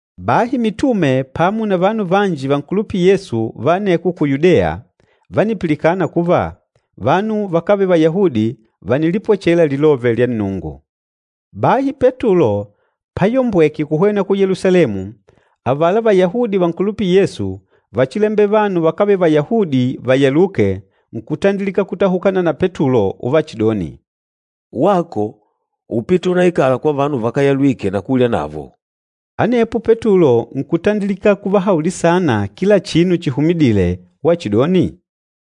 Bahi mitume pamo na vanu vanji vankulupîla Yesu va aneko ku Yudeya vánipilikana kuva, vanu vakávele Vayahudi vànilipwechela Lilove lya Nnungu. Bahi Petulo payombweke kuhwena ku Yelusalemu, avala Vayahudi vankulupîla Yesu vachilembela vanu vakávele Vayahudi vayaluke nkutandilika kutahukana na Petulo uvachidoni, “Wako úpite unaikala kwa vanu vakáyalwike na kulya navo!” Anepo Petulo nkutandilika kuvahaulila saana kila chinu chihumidile wachidoni,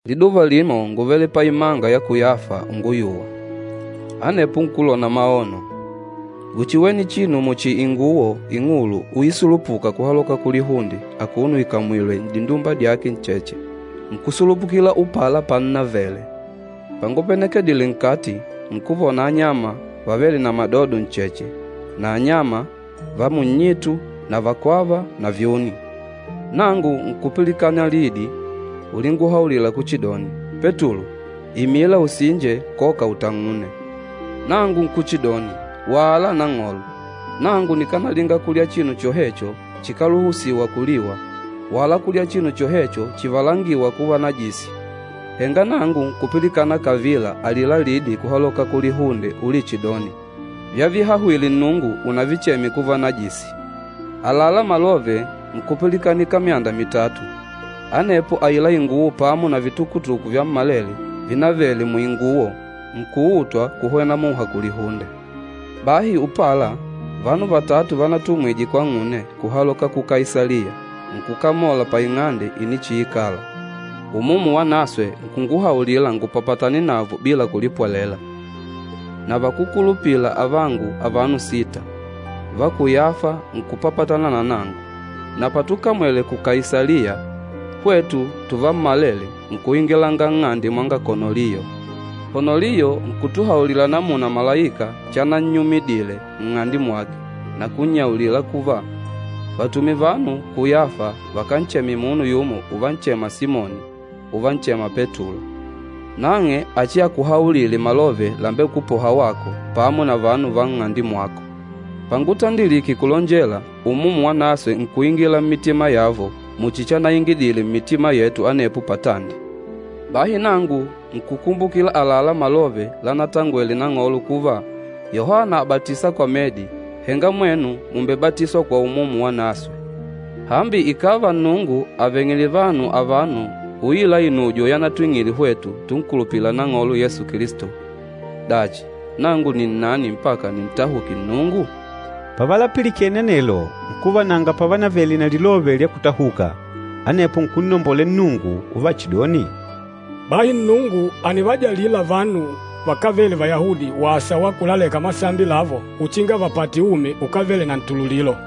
“Liduva limo ngúvele paimanga ya ku Yafa unguyuwa. Anepo nkulona maono. Ngúchiwene chinu muchi inguwo ing'ulu uisulupuka kuhaloka kulihunde akuno ikàmwilwe n'dindumba dyake ncheche, nkusulupukila upala pannavele. Pangupenekedile nkati, nkuvona anyama vavêle na madodo ncheche na anyama va munnyitu na vakwava na vyuni. Nangu nkupilikana lidi ulinguhaulila kuchidoni, ‘Petulo, imila usinje koka utang'une.’ Nangu nkuchidoni, ‘Wala Nang'olo! Nangu nikanalinga kulya chinu chohecho chikáluhusiwa kuliwa, wala kulya chinu chohecho chivalangîwa kuva najisi.’ Henga nangu nkupilikana kavila alila lidi kuhaloka kulihunde ulichidoni, ‘Vyavihahwile Nnungu, unavicheme kuva najisi.’ Àlalá malove nkupilikanika myanda mitatu, anepo aila inguwo pamo na vitukutuku vyammalele vinavele muinguwo nkuutwa kuhwena muha kulihunde. Bahi upala, vanu vatatu vanatumwije kwang'une kuhaloka ku Kaisaliya nkukamola paing'ande inichiikala. Umumu Wanaswe nkunguhaulila ngupapatane navo bila kulipwelela. Na vakúkulupila avangu avano sita va ku Yafa nkupapatana na nangu, na patukamwele ku Kaisaliya, hwetu tuvammalele nkuingilanga nng'ande mwanga Konoliyo. Konoliyo nkutuhaulila namuna malaika chanannyumidile nng'ande mwake na kunnyaulila kuva, ‘Vatume vanu ku Yafa vakancheme munu yumo uvanchema Simoni, uvanchema Petulo. Nang'e achiakuhaulile malove lambekupoha wako pamo na vanu va nng'ande mwako.’ Pangutandilike kulonjela, Umumu Wanaswe nkuingila mmitima yavo muchi chanaingidile mmitima yetu anepo patandi. Bahi nangu nkukumbukila àlalá malove lanatangwele Nang'olo kuva, ‘Yohana àbatisa kwa medi, henga mwenu mùmbebatiswa kwa Umumu Wanaswe.’ Hambi ikàva Nnungu àveng'ile vanu avano uila inujo yanatwing'ile hwetu tunkulupîla Nang'olo Yesu Kilisto, dachi, nangu nni nnani mpaka nintahuke Nnungu?” Pavalapilikene anelo nkuva nanga pavanavele na lilove lya kutahuka, anepo nkunnombolela Nnungu uvachidoni, “Bahi Nnungu ànivajalila vanu vakávele Vayahudi wasa wa kulaleka masambi lavo uchinga vapate umi ukávele na ntululilo!”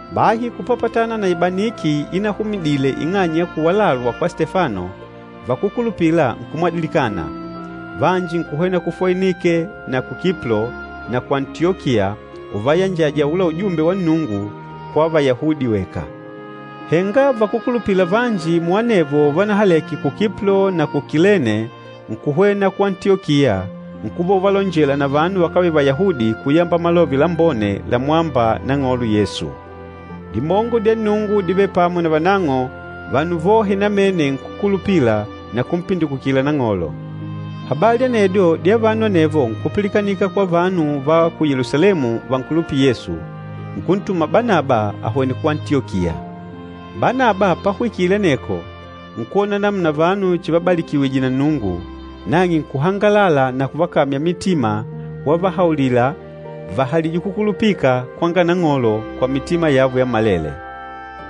Bahi kupapatana na ibaniki inahumidile ing'anya ya kuwalalwa kwa Stefano, vakúkulupila nkumwadilikana. Vanji nkuhwena ku Foinike na ku Kiplo na ku Antiyokiya uvayanjaja aula ujumbe wa Nnungu kwa Vayahudi weka. Henga vakúkulupila vanji muanavo vanahaleke ku Kiplo na ku Kilene nkuhwena ku Antiyokiya nkuva uvalonjela na vanu vakávele Vayahudi kuyamba Malove Lambone lamwâmba Nang'olo Yesu. Dimongo dya Nnungu dívele pamo na vanang'o, vanu vohe namene nkukulupila na kumpindikukila Nang'olo. Habali anedyo dya vanu anevo nkupilikanika kwa vanu va ku Yelusalemu vankulupîla Yesu, nkuntuma Banaba ahwene ku Antiyokiya. Banaba pahwikile aneko nkwona namuna vanu chivabalikiwije na Nnungu, nang'e nkuhangalala na kuvakamya mitima wavahaulila vahalije kukulupika kwanga Nang'olo kwa mitima yavo yammalele.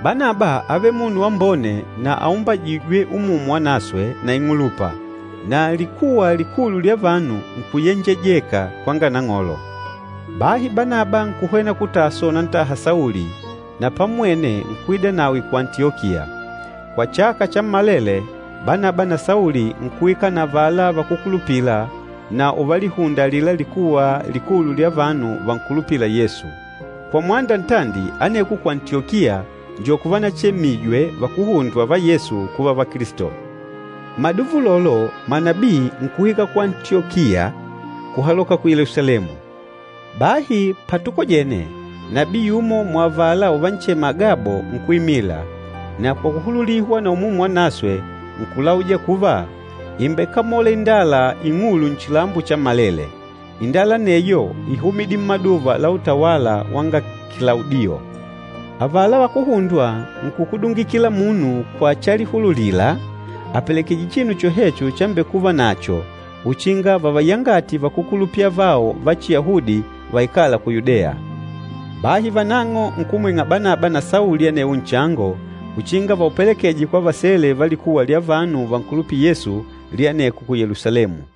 Banaba ávele munu wambone na aumbajîjwe Umumu Wanaswe na ing'ulupa, na likuwa likulu lya vanu nkuyenjejeka kwanga Nang'olo. Bahi Banaba nkuhwena ku Taso unantaha Sauli, na pammwene nkuidanawe ku Antiyokiya. Kwa chaka chammalele, Banaba na Sauli nkuikala na avala vakúkulupila na uvalihunda alila likuwa likulu lya vanu vankulupîla Yesu. Kwa mwanda ntandi aneko ku Antiyokiya njo kuvanachemijwe vakuhundwa va Yesu kuva Vakilisto. Mmaduva ulolo manabii nkuhwika ku Antiyokiya kuhaloka ya ku Yelusalemu. Bahi patukojene, nabii yumo muavala uvanchema Agabo nkuimila, na kwa kuhululihwa na Umumu Wanaswe nkulauja kuva, ìmbekamola indala ing'ulu nchilambo chammalele. Indala aneyo íhumidile mmaduva la utawala wanga Kilaudiyo. Avala vakuhundwa nkukudungila kila munu kwa chalihululila apelekeje chinu chohecho chambekuva nacho uchinga vavayangate vakúkulupila avao va Chiyahudi vaikâla ku Yudeya. Bahi vanang'o nkumwing'a Banaba na Sauli anewo nchango uchinga vaupelekeje kwa vasele va likuwa lya vanu vankulupîla Yesu lya aneko ku Yelusalemu.